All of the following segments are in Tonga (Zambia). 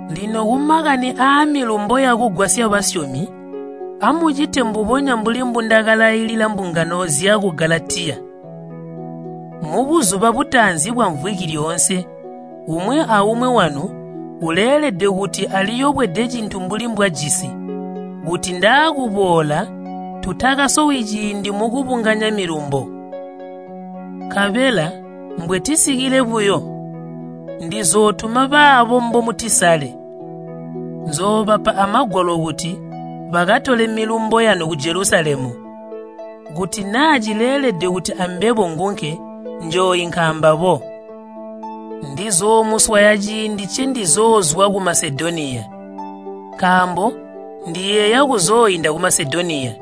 Lino kumakani aamilumbo yakugwasya basyomi, amucite mbubonya mbuli mbundakalailila mbungano zyaku Galatiya. Mubuzuba butaanzi bwamvwiki lyoonse umwi aumwi wanu uleelede kuti aliyobwede cintu mbuli mbwajisi, kuti ndaakuboola tutakasowi ciindi mukubunganya milumbo. Nkabela mbwetisikile buyo, ndizootuma baabo mbomutisale, nzoobapa amagwalo kuti bakatole milumbo yanu ku Jelusalemu. Kuti naa cileelede kuti ambebo ngunke, njooinka ambabo. Ndizoomuswaya ciindi ncendizoozwa ku Masedoniya, nkaambo ndiyeeya kuzooinda ku Masedoniya.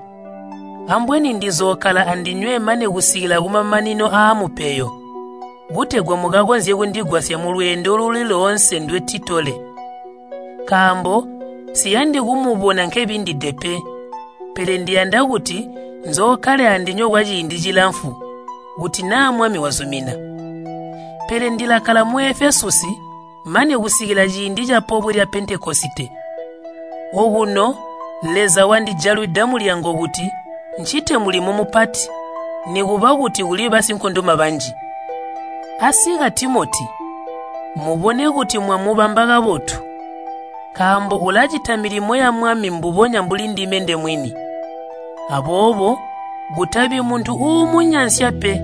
Ambweni ndizookkala andinywe mane kusikila kumamanino aamupeyo, kutegwa mukakonzye kundigwasya mulweendo luli loonse ndwetitole. Nkaambo nsiyandi kumubona nkebindide pe, pele ndiyanda kuti nzookkale andinywe kwaciindi cilamfu, kuti naa Mwami wazumina. Pele ndilakkala mu Efesusi mane kusikila ciindi ca Pobwe lya Pentekosite. Okuno Leza wandijalwida mulyango kuti ncite mulimo mupati, nikuba kuti kuli basinkondoma banji. Asika Timoti, mubone kuti mwamubamba kabotu, nkaambo ulacita milimo ya Mwami mbubonya mbuli ndime ndemwini. Aboobo kutabi muntu uumunyansya pe.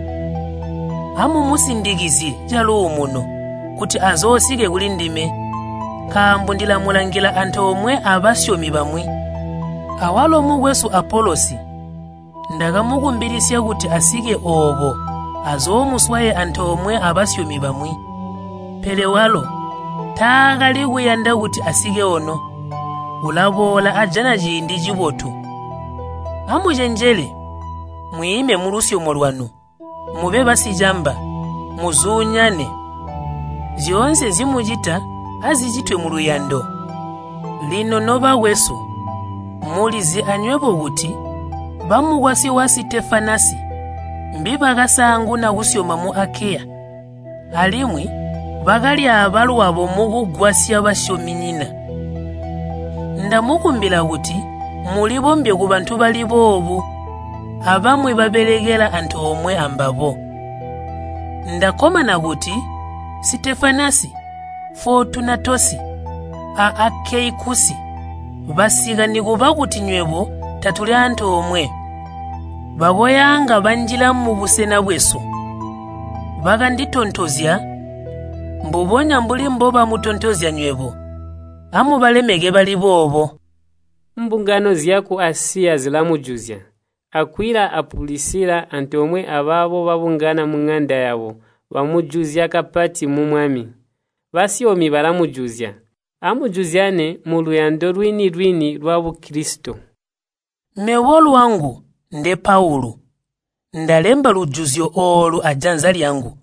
Amumusindikizye caluumuno, kuti azoosike kulindime, nkaambo ndilamulangila antoomwe abasyomi bamwi. Awalo mukwesu Apolosi, ndakamukumbilisya kuti asike ooko azoomuswaye antoomwe abasyomi bamwi, pele walo taakali kuyanda kuti asike ono. Ulaboola ajana ciindi cibotu. Amucenjele, mwiime mulusyomo lwanu, mube basicamba, muzuunyane. Zyoonse nzimucita azicitwe muluyando. Lino nobakwesu, mulizi anywebo kuti bamukwasyi wa Sitefanasi, mbibakasaanguna kusyoma mu Akeya, alimwi bakalyaaba lwabo mukugwasya basyominyina. Ndamukumbila kuti mulibombye kubantu bali boobo abamwi babelekela antoomwe ambabo. Ndakkomana kuti Sitefanasi, Footunatosi, a Akeikusi, basika nikuba kuti nywebo tatuli antoomwe, bakoyaanga banjila mubusena bwesu. Bakanditontozya mbubonya mbuli mbobamutontozya nywebo. Amubalemeke bali boobo. Mbungano zyaku Asiya zilamujuzya. Akwila a Pulisila antomwe abaabo babungana muŋanda yabo bamujuzya kapati mu Mwami. Basyomi balamujuzya. Amujuzyanye muluyando lwini-lwini lwa Bukilisito. Mebo lwangu, nde Paulu, ndalemba lujuzyo oolu ajanza lyangu.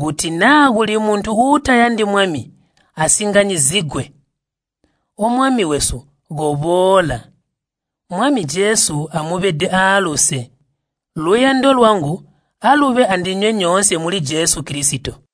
Kuti naa kuli muntu uutayandi Mwami, asinganyizigwe. O Mwami wesu, koboola! Mwami Jesu amubede aaluse. Luyando lwangu alube andinywe nyoonse muli Jesu Kilisito.